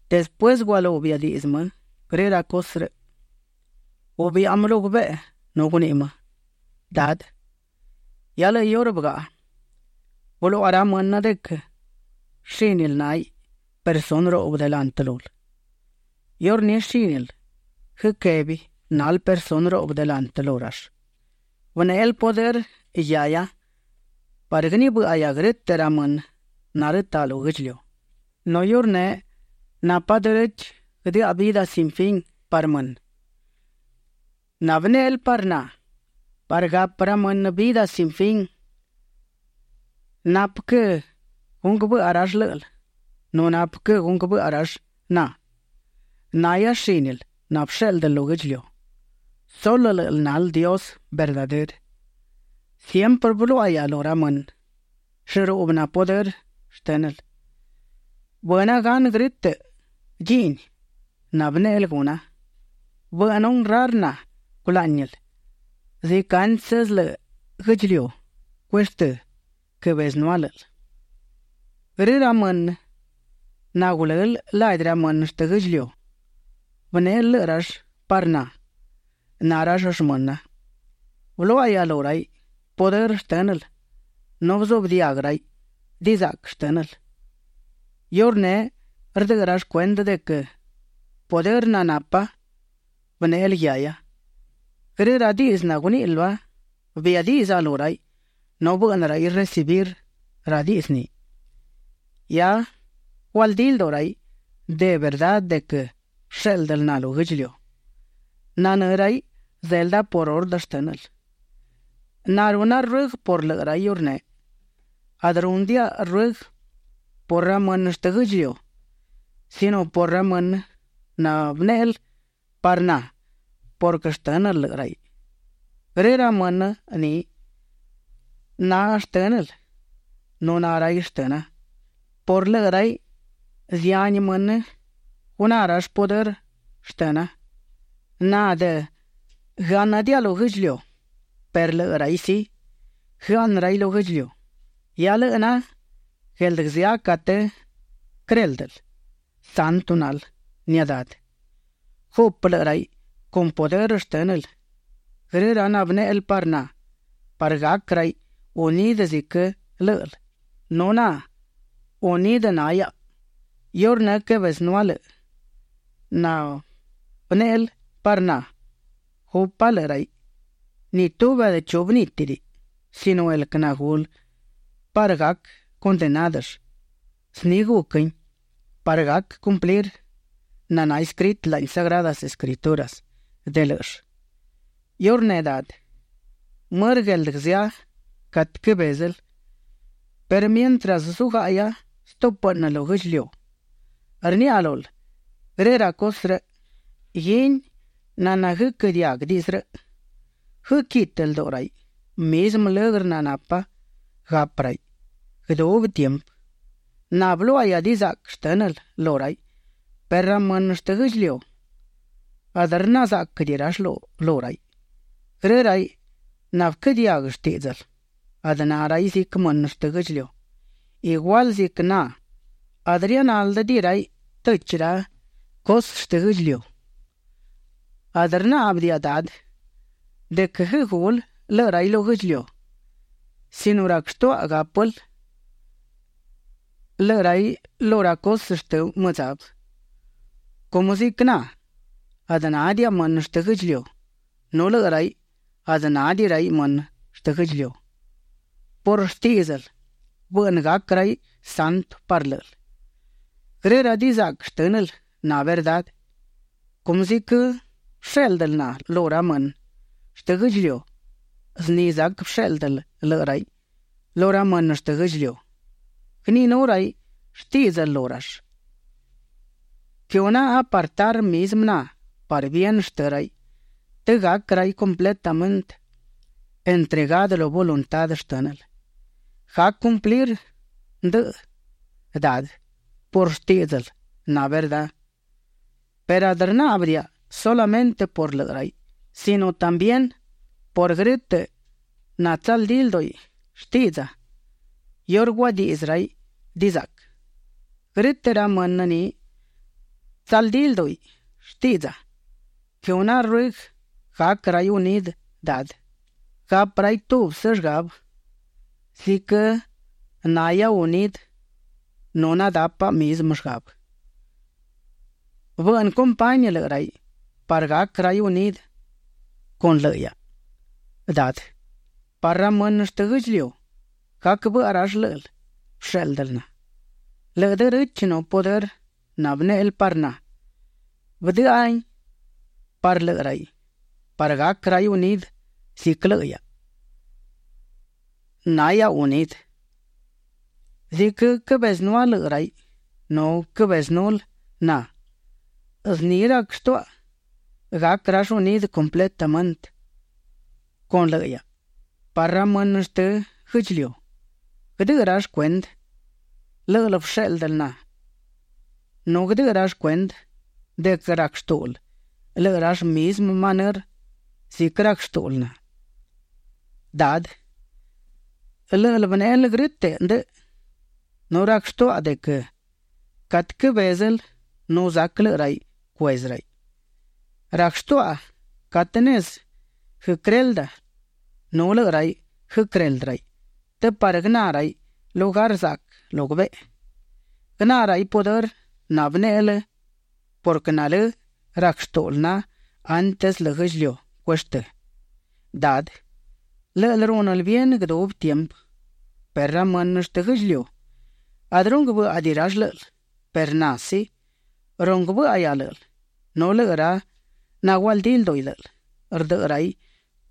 Despuësë gualú biadiꞌdzë më grë ra cusë rëꞌ, gubiꞌa më lu gubeꞌe nu guniꞌi më: ―Dadë, hia lëꞌë iurë bëgaꞌa. Bëluaꞌa ra mënë de quë shínil náhiꞌ personë ruꞌbë delantë lul. Iurní shínil guëquébiꞌ nal personë ruꞌbë delantë lu rall. Bënéꞌel pudërë guiahia parë guënibë́ꞌahia grë́tëꞌ ra mënë narëtaꞌ lu guë́ꞌdchiliu, nu iurneꞌ napa derechë guëdëꞌa vidë sin fin parë mënë nabënéꞌel parë na. Parë gapë ra mënë vidë sin fin, napë quë gunguë bëꞌa rall lë́ꞌël nu napë quë gunguë bëꞌa rall na. Nahia shínil nabëshéꞌldël lu guë́ꞌdchiliu. Sulë lë́ꞌël nal Dios verdadërë. ’Siemprë bëluáꞌahia lu ra mënë llëruꞌbë na pudërë shtë́nël. Bëna gan grë́tëꞌ dchiꞌni nabënéꞌel guna. Bëꞌnë honrar na culáꞌnil ziquë antsë lëꞌë guë́ꞌdchiliu cueshtë́, quëbezënúa lë́ꞌël. ’Grë ra mënë nagulël ladi ra mënë shtë guë́ꞌdchiliu, bënéꞌel lëꞌë rall parë na; na rall shmëna. Bëluáꞌahia lu raiꞌ pudërë shtë́nël nu bëzuꞌbë diaguë raiꞌ dizaꞌquë shtë́nël. Iurneꞌ rdëꞌë rall cuendë de quë pudërë nanapa, bënéꞌel guiahia. Grë ra diꞌdzë naguníꞌil lua, biadiꞌdza lu raiꞌ nu bëꞌnë raiꞌ recibir ra diꞌdzë ni. Hia gualdí lduꞌu raiꞌ de verdá de quë bëshéꞌldël na lu guë́ꞌdchiliu. Nanë́ raiꞌ zelda por ordë shtë́nël. ’Na runa ruëguë por lëꞌë raiꞌ iurneꞌ. Adë rúnëdiaꞌa ruëguë por ra mënë shtë guë́ꞌdchiliu sino por ra mënë nabënéꞌel parë na purquë shtë́nël lëꞌë raiꞌ. Grë ra mënë ni nashtë́nël nu na raiꞌ shtëna. Por lëꞌë raiꞌ zihani mënë guná rall pudërë shtëna. ’Na adë guëáꞌnëdiaꞌa lu guë́ꞌdchiliu, perë lëꞌë raiꞌ sí, guëaꞌnë raiꞌ lu guë́ꞌdchiliu. Hia lëꞌë na gueldë guëzë́a catë quëréldël. Santo nal, nia Dadë. Gupë lëꞌë raiꞌ con pudërë shtë́nël grë ra nabënéꞌel parë na parë gac raiꞌ unidë ziquë lë́ꞌël nu na unidë na hiaꞌa. Iurë quëbezënúa lëꞌë nabënéꞌel parë na, gupa lëꞌë raiꞌ. Ni tubi adë chu bënítidiꞌi sino el quë nagulë parë gac condenádëll. Zni guquin parë gac cumplir naná escritë laꞌni Sagradas Escrituras de lë́ꞌëll. ’Iurneꞌ Dadë, mërë gueldë guëzë́a catë quëbézël perë mientras zugáꞌahia stúpëꞌnë lu guë́ꞌdchiliu, rniaꞌa lul grë ra cusë rëꞌ, guini naná guëquë́ diaguë diꞌdzë rëꞌ. Guëquitë lduꞌu raiꞌ; mizmë lëgrë nanapa gapë raiꞌ guëdubi tiempë. Na bëluáꞌahia dizaꞌquë shtë́nël lu raiꞌ perë ra mënë shtë guë́ꞌdchiliu, adë rna záꞌquëdiꞌi rall lu raiꞌ. Grë raiꞌ nabëquë́ diaguë shtíꞌdzël, adë na raiꞌ ziquë mënë shtë guë́ꞌdchiliu; igual ziquë na, adë rianáldëdiꞌi raiꞌ tëchi ra cusë shtë guë́ꞌdchiliu. Adë rnáꞌbëdiaꞌa, Dadë, de quë guëgul lëꞌë raiꞌ lu guë́ꞌdchiliu, sino rac shtuaꞌa gápël lëꞌë raiꞌ lu ra cusë shtë mëdzabë. Cumë ziquë na, adë nádiaꞌa mënë shtë guë́ꞌdchiliu, nu lëꞌë raiꞌ adë nádiꞌi raiꞌ mënë shtë guë́ꞌdchiliu. Por shtíꞌdzël bëꞌnë gac raiꞌ santu parë lë́ꞌël. Grë dizaꞌquë shtë́nël na verdá. Cumë ziquë bëshéꞌldël na lu ra mënë shtë guë́ꞌdchiliu, zni zac bësheꞌlda lëꞌë raiꞌ lu ra mënë shtë guë́ꞌdchiliu. Guëniꞌinú raiꞌ shtíꞌdzël lu rall. Quëhuna apartar mizmë na parë bien shtë raiꞌ të gac raiꞌ completamente entregadë lu voluntá shtë́nël. Gac cumplir ndëꞌë, Dadë, por shtíꞌdzël naná verdá. ’Perë adë rnáꞌbëdiaꞌa sulamëntë por lëꞌë raiꞌ, sino también por grë́tëꞌ natsaldí lduꞌi shtiꞌdza iurë guadiꞌdzë raiꞌ dizaꞌquë. Grë́tëꞌ ra mënë ni natsaldí lduꞌi shtiꞌdza, quëhuna ruëguë gac raiꞌ unidë, Dadë. Gapë raiꞌ tubsë llgabë ziquë na hiaꞌa unidë nu nadápaꞌa mizmë llgabë. Bëꞌnë compañi lëꞌë raiꞌ parë gac raiꞌ unidë con lëꞌë hiaꞌa, Dadë, parë ra mënë shtë guë́ꞌdchiliu, gac bëꞌa rall lë́ꞌël bëshéꞌldël na. Lëꞌë derechë nu pudërë nabënéꞌel parë na, bëdë́ꞌëhia parë lëꞌë raiꞌ parë gac raiꞌ unidë ziquë lëꞌë hiaꞌa na hiaꞌa unidë. Ziquë quëbezënúa lëꞌë raiꞌ nu quëbezënul na, zni rac shtuaꞌa gac rall unidë completamente con lëꞌë hiaꞌa parë ra mënë shtë guë́ꞌdchiliu, guëdëꞌë rall cuendë lë́ꞌël bëshéꞌldël na nu guëdëꞌë rall cuendë de quë rac shtúꞌul lëꞌë rall mizmë manërë ziquë rac shtúꞌul na. ’Dadë lë́ꞌël bënéꞌel grë́tëꞌ ndëꞌë, nu rac shtuaꞌa de quë catë quëbézël nu zac lëꞌë raiꞌ cuezë raiꞌ. Rac shtuaꞌa catë nezë guëquërelda nu lëꞌë raiꞌ guëquëreldë raiꞌ të parë guëná raiꞌ lugar zaꞌquë lu gubeꞌe. Guëná raiꞌ pudërë nabënéꞌel purquë nalë́ rac shtúꞌul na antsë lëꞌë guë́ꞌdchiliu cueshtë́. Dadë, lë́ꞌël rúnël bien guëdubi tiempë perë ra mënë shtë guë́ꞌdchiliu, adë runguë bë́ꞌadiꞌi rall lë́ꞌël, perë na sí, runguë bë́ꞌahia lë́ꞌël nu lëꞌë ra nagualdí lduꞌi lë́ꞌël, rdëꞌë raiꞌ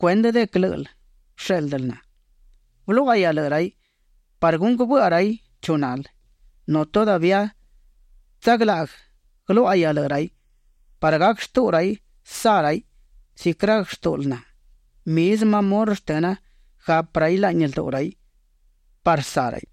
cuendë de quë lë́ꞌël bëshéꞌldël na. Bëluáꞌahia lëꞌë raiꞌ parë gunguë bëꞌa raiꞌ chu nal, nu todavía tsaglaꞌguë guëluáꞌaruꞌuhia lëꞌë raiꞌ parë gac shtuꞌu raiꞌ saꞌ raiꞌ ziquë rac shtúꞌul na; mizmë amor shtëna gapë raiꞌ laꞌni lduꞌu raiꞌ parë saꞌ raiꞌ.